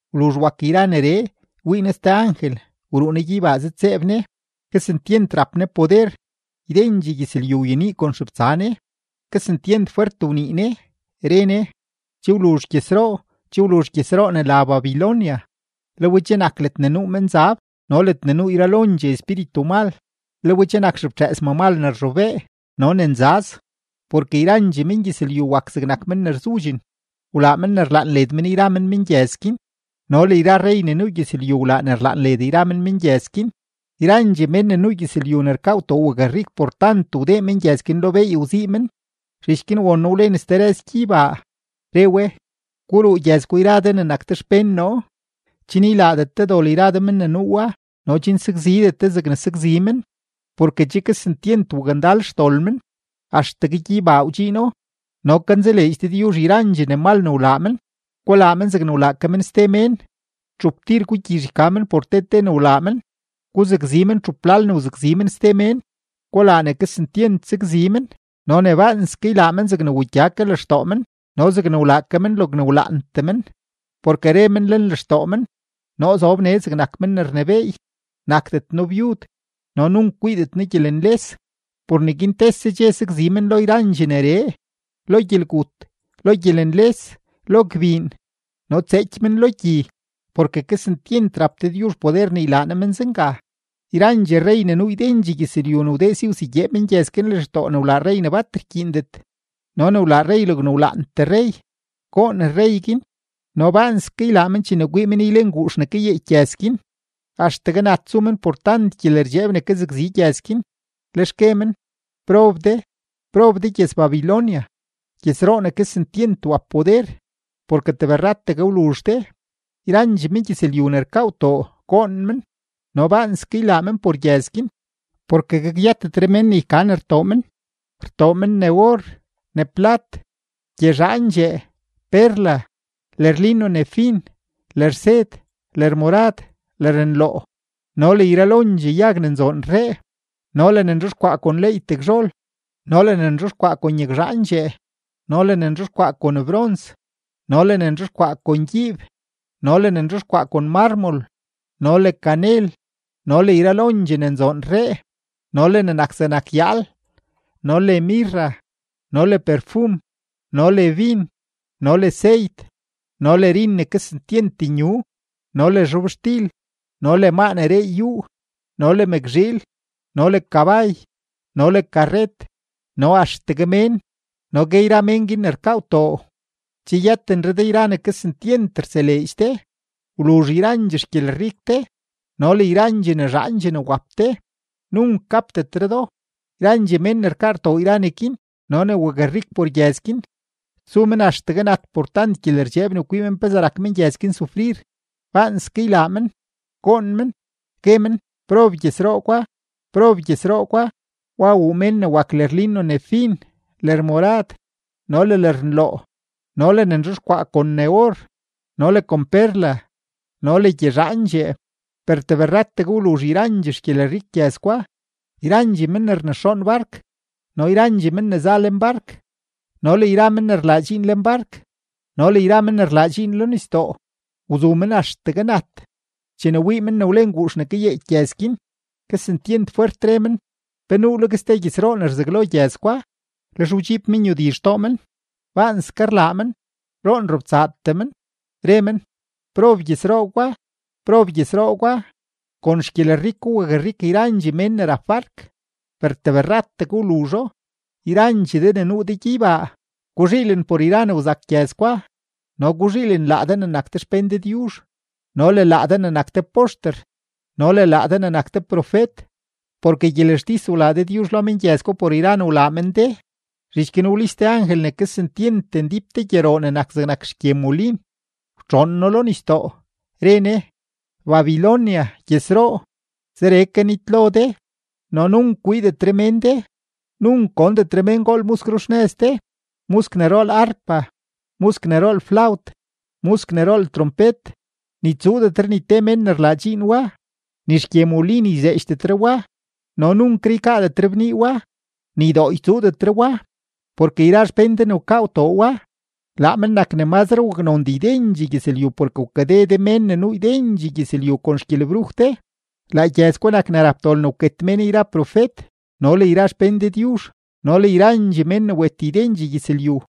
Wluzh wak yra neree, wii noo ste angel, wruu ne gyeybaa zëdtseeb ne. Kesentyent rap ne poder; ydendxee gyëzlyu wyenii kon xebtsa ne. Kesentyent fwert wnii ne, re ne: ―Che wluzh gyëzroo, che wluzh gyëzroo ne la Babilonia; le we che nak ledne nuu menzab no ledne nuu yralondxee espíritu mal, le we che nak xeftxëës mamal ne rzhobee no ne nzaz. Porke yrandxee mengyëzlyu wak zegnak men ne rzudxen, wlaa men ne rlaan led men yra men mengyëz guin, no le yra rrey ne nuu gyëzlyu wlaa ne rlaan led yra men mengyëz guin; yrandxee mén ne nuu gyëzlyu ne rkaa gwtoo wakrik por tant wdee mengyëz guin lo beey wzii men. Zhich guin won noo wlen ste rëz gyeybaa, re we: ―Guruu gyëz gwa yra de ne nak de xpén noo, chen ylaadet de dol yra de men ne nuu wa no chen sakzidet de zegne sakzi men; porke che kesentyent wakndal xdol men, axtegue gyeybaa wdxiino, no kanzaleedx Dëdyuzh yrandxee ne mal ne wlaa men. Gulaa men zegne wlaa ke men ste mén; txup tir gugyizh yka men por te te ne wlaa men; guzakzi men txup lal ne wzakzi men ste mén. Gulaa ne kesentyent sakzi men no ne baanske ylaa men zegne wugya ke lextoo men no zegne wlaa ke men logne wlaantee men, porke re men lenlextoo men: “Noo zob nee zegnak men ne rnebééy; nakdet noo byud no nunk kwiidet noo gyelenles.” Por neguin tese dxe sakzi men lo yrandxee neree: lo gyelgut, lo gyelenles, lo gbiin, no tseeky men lo gyi; porke kesentyent rap Dëdyuzh poder ne ylaa Ne men zenga. Yrandxee rrey ne nuu ydendxee gyëzlyu ne wdee si wsegyee mengyëz guin lextoo ne wlaa rrey ne bat rkyiindet no ne wlaa rrey logne wlaantee rrey, goon rrey guin no baanske ylaa men chene kwii men ylen guux ne kayeeky gyëz guin. Axtegue nat su men por tant gyelerdxeeb ne kazakzi gyëz guin, lex gue men: ―¡Prob de, prob de gyëz-Babilonia, gyëzroo ne kesentyent wap poder! Porke tebrrategue wluzh de. Yrandxee mengyëzlyu ne rkaa gwtoo, goon men no baanske ylaa men por gyëz guin, porke gakyëtetre mén ne yka ne rtoo men. Rtoo men: ne or, ne plat, gyezhaandxee, perla, lërlino ne fin, lërsed, lërmorad, lërnloo, no le yralondxee yag ne nzoon rree, no le ne nzhexkwaa kon leey tegzhol, no le ne nzhexkwaa kon yagzhaandxee, no le ne nzhexkwaa kon brons, no le ne nzhexkwaa kon gyiib, no le ne nzhexkwaa kon mármol, no le kanel, no le yralondxee ne nzoon rree, no le ne nak zegnak yaal, no le mirra, no le perfum, no le bin, no le seyt, no le rin ne kesentyent nyu, no le zhobxtil, no le maa ne reey yúú, no le mëkzhiil, no le kabay, no le karret no axtegue mén. No gue yra mén guin ne rkaa gwtoo: ―¡Che yëtenre de yra ne kesentyent rtseleedx de; wluzh yrandxee xgyelrik de no le yrandxee ne zhaandxee ne wap de! Nunk gapdetre do. Yrandxee mén ne rkaa rtoo yra neguin no ne wakrik por gyëz guin, su men axtegue nat por tant gyelerdxeeb ne kwii men pezee rak mengyëz guin sufrir, baanske ylaa men, goon men, gue men: ―¡Prob gyëzroo gwa! ¡Prob gyëzroo gwa! Wa wuu mén ne wak lërlino ne fin, lërmorad, no le lërnloo, no le ne nzhexkwayaa kon ne or no le kon perla no le gyezhaandxee. ¡Per tebrrategue wluzh yrandxee xgyelrik gyëz gwa! Yrandxee men ne rnexoon bark no le yrandxee men ne za lenbark no le yra men ne rlaa dxiin lenbark no le yra men ne rlaa dxiin lo nisdoo, wzu men axtegue nat, chene wii men wlen guux ne kayeeky gyëz guin, kesentyent fwert re men: ―¿Pe nuuleg ste gyëzroo ne rzaglo gyëzroo gwa? Lex wdxiib men yudi xtoo men, baanske rlaa men, roon robtsaatee men, re men: ―¡Prob gyëzroo gwa! ¡Prob gyëzroo gwa! Kon xgyelriko wakrik yrandxee mén ne rap bark, ¡per tebrrategue wluzho! Yrandxee de ne nuu de gyeybaa, guzhiilen por yra ne wzak gyëz gwa, no guzhiilen laa de ne nak de xpén Dëdyuzh no le laa de ne nak de poxter no le laa de ne nak de profet; porke gyelextis wlaa Dëdyuzh lo mengyëz gwa por yra ne wlaa men de. Zhich guin wlis te angel ne kesentyent ndíp te gyeroo ne nak zegnak xgye molin, wtxoon no lo nisdoo, re ne: ―Babilonia gyëzroo, zeree ke nitlo de no nunk kwiidetre mén de. Nunk gondetre mén gool musk ruxnëz de, musk ne rool arpa, musk ne rool flawt, musk ne rool trompet, ni tsuudetre ni te mén ne rlaa dxiin wa, ni xgye molin yzheedxdetre wa. No nunkre ykaadetre bnii wa, ni dooy tsuudetre wa; porke yra xpén de ne wkaa gwtoo wa, laa men nak ne mazre waknondee ydendxee gyëzlyu porke wkade de mén ne nuu ydendxee gyëzlyu kon xgyelebruj de. Laa gyëz gwa nak ne rap dol ne wket mén yra profet no le yra xpén Dëdyuzh no le yrandxee mén ne wet ydendxee gyëzlyu.